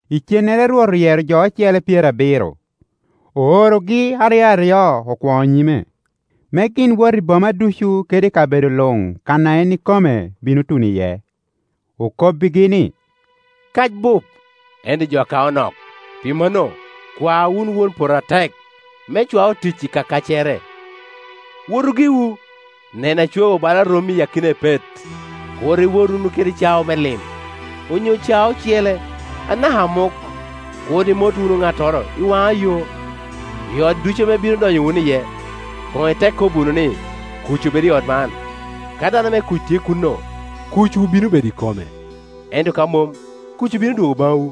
Icennere Rwot oyero jo ocele pyerabiro, oorogi aryo aryo okwoŋo nyime, me gin wot i boma ducu kede i kabedo luŋ kan a en ikome bino tuno iye. Okobbigi ni, “Kac bup, ento jo a kao nok Pi mano, kwa wunu Won poto atek me cwa otic i ka kaccere. Wotu giwu; nen, acwaowu bala rommi i akina epet. Kur iwot wunu kede cao me lim, onyo cao ocele, anaka amuk; kur imot wunu ŋattoro i waŋa yo, i ot ducu ame ibino donyo wunu iye koŋ itek kobo wunu ni, ‘Kuc obed i ot man!’ Ka dano me kuc tye kuno, kucwu bino bedo i kome; ento ka mom, kucwu bino dwogo baŋwu.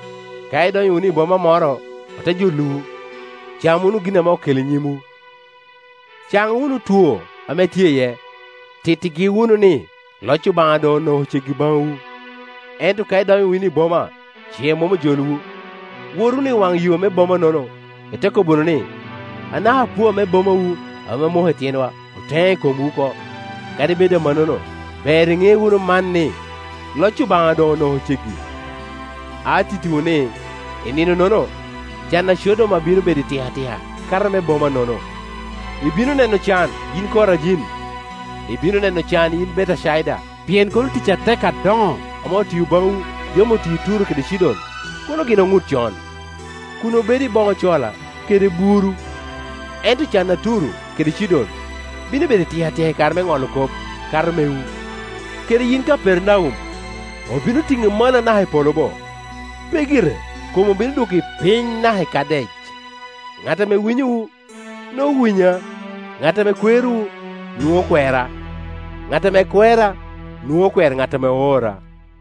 Ka idonyo wunu i boma moro ote jolowu, cam wunu gin ame oketo i nyimwu; can wunu otwo ame tye iye, tittigi wunu ni, ‘Loc Obaŋa doŋ onoko ceggi baŋwu.’ Ento ka idonyo wunu i boma, ce mom ojolowu, wot wunu i waŋa yo me boma-nono, ite kobo wunu ni. ‘Anaka apua me bomawu ame omoko i tyenwa oteŋo i komwu oko; kadi bed amannono, ber iŋe wunu man ni, loc Obaŋa doŋ onoko ceggi.’ Atittiwu ni, i nino-nono, can a Codoma bino bedo itikatika, kato me bomanono. “Ibino neno can, yin Korajin! Ibino neno can, yin Betecaida! Pien kono tic atek adoŋo ame otio baŋwu, yam otio i Turo kede Cidon, kono gin oŋut con, kun obedo i boŋo cola kede buru. Ento can a Turo kede Cidon bino bedo itikatika i kare me ŋolo kop, kato mewu. Kede yin Kapernaum, obino tiŋi malo anaka i polo bo? Pe gire; kom obino dwoki piny naka i Kadec. “Ŋat ame winyowu, nwoŋo owinya; ŋat ame kwerowu, nwoŋo okwera; ŋat ame kwera, nwoŋo okwero ŋat ame oora.”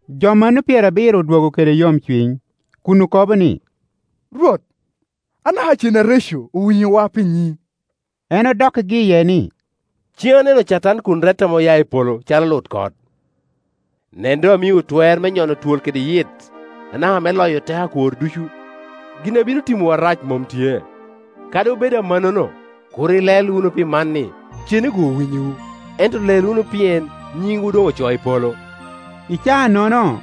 Jo mano pyerabiro odwogo kede yomcuny, kun okobo ni, “Rwot, anaka cen areco owinyowa pi nyiŋi!” En odokkigi iye ni, “Cen aneno Catan kun rette ame oya i polo calo lutkot. Nen, doŋ amiowu twer me nyono twol kede yit, anaka me loyo teko akwor ducu; gin a bino timowu arac mom tye. Kadi obedo amannono, kur ilel wunu pi man, ni cene-gu owinyowu; ento lel wunu pien nyinwu doŋ ocoo i polo.” I caa-nono,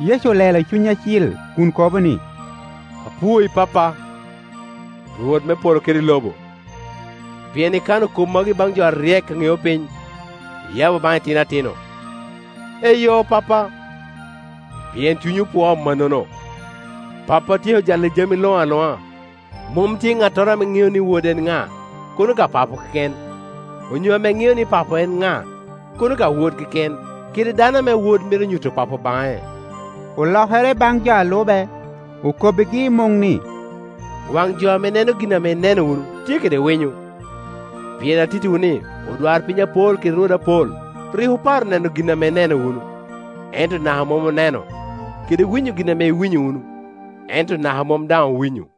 Yecu olelo i Cuny Acil kun kobo ni, “Apwoyi, Pappa, Rwot me polo kede lobo, pien ikano kop magi baŋ jo aryek a ŋeo piny, iyabo baŋ itino atino. Eyo, Pappa, pien cunyi opwoo amannono. Pappa otyeko jalla jami luŋ aluŋa: mom tye ŋattoro ame ŋeo ni Wod en ŋa, kono ka Papo keken, onyo ame ŋeo ni Papo en ŋa, kono ka Wod keken, kede dano ame Wod mito nyuto Papo baŋe.” Olokere baŋ jo a lube, okobbigi i muŋ ni, “Wan jo ame neno gin ame ineno wunu tye kede winyo! Pien atittiwu ni, odwarpiny apol kede rwode apol rik oparo neno gin ame ineno wunu, ento naka mom oneno, kede winyo gin ame ame iwmyo wunu ento naka mom daŋ owinyo.”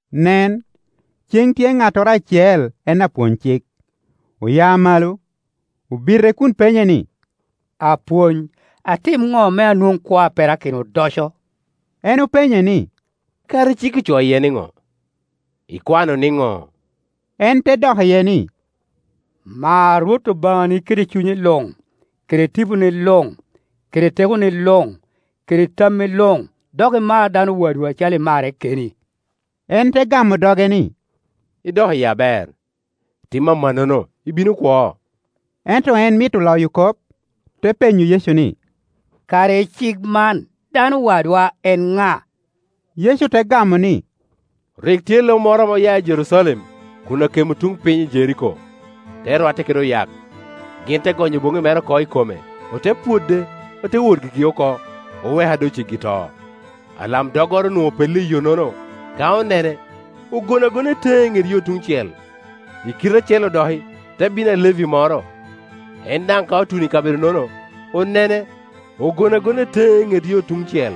Nen, ceŋ tye ŋattoro acel en apwony-cik. Oya malo, obite kun penye ni, “Apwony, atim ŋo me anwoŋ kwo a perakino odoco?” En openye ni, “Kara i cik ocoo iye niŋo? Ikwano niŋo?” En te dok iye ni, “Mar Rwot Obaŋani kede cunyi luŋ, kede tiponi luŋ, kede tekoni luŋ, kede tammi luŋ; dok imar dano wadwu acalo imarre keni.” En te gamo doge ni, “Idok iye aber; tim amannono, ibino kwo.” Ento en mito loyo kop, te penyo Yecu ni, “Kara i cik man, dano wadwa en ŋa?” Yecu te gamo ni, “Rik tye lo moro ame oya i Jerucalem, kun akemo tun piny i Jeriko, te rwatte kede oyak. Gin te gonyo boŋŋi mere oko i kome, ote pwode, ote wot gigi oko, oweke a doŋ ceggi i to. Alamdoggoro onwoŋo opello i yo-nono; ka onene, ogono agona i teŋe i ŋet yo tuŋ cel. I kite acel-Iu dok te bino Alevi moro; en daŋ ka otuno i kabedo-nono, onene, ogono agona i teŋe i ŋet yo tuŋ cel.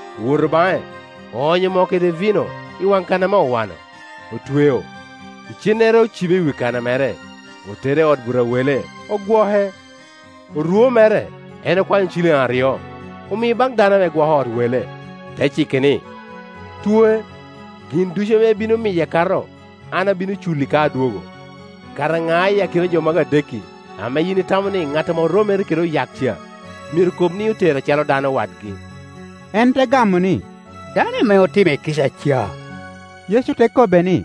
Owoto baŋe, oonyo moo kede vino i waŋ kan ame owano, otweo, icennere ocibe i wi kana mere, otere i ot buto a wele, ogwoke. Orwo mere en okwanyo ciliŋ aryo, omio baŋ dano ame gwoko ot wele, te cike ni, ‘Twoe; gin ducu ame ibino miye akato, an abino culli ka adwogo.’ Kara ŋa i akina jo magi adek-ki ame yin itamo ni ŋat ame oromere kede oyak ca myero kolo ni otere acalo dano wadgi?” En te gamo ni, “Dano ame otime kica ca.” Yecu te kobbe ni,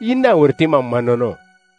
“Yin daŋ wot itim amannono.”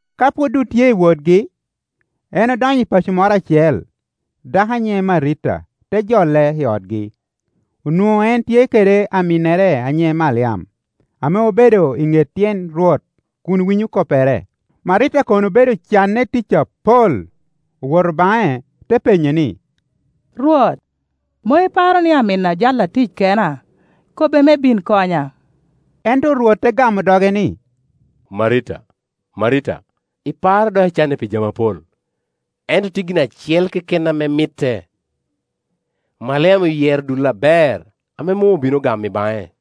Ka pwod otye i wotgi, en odonyo i paco moro acel, dako a nyiŋe Marita te jole i otgi. Onwoŋo en tye kede aminnere a nyiŋe Maliam, ame obedo i ŋet tyen Rwot kun winyo koppere. Marita kono obedo canne i tic apol. Owoto baŋe, te penye ni, “Rwot, mom iparo ni aminna ojala tic kena? Kobe me bin konya.” Ento Rwot te gamo doge ni, “Marita, Marita, iparo dok icanne pi jami apol; ento tye gin acel keken ame mitte. Maliam oyero dul aber ame mom obino gamo i baŋe.”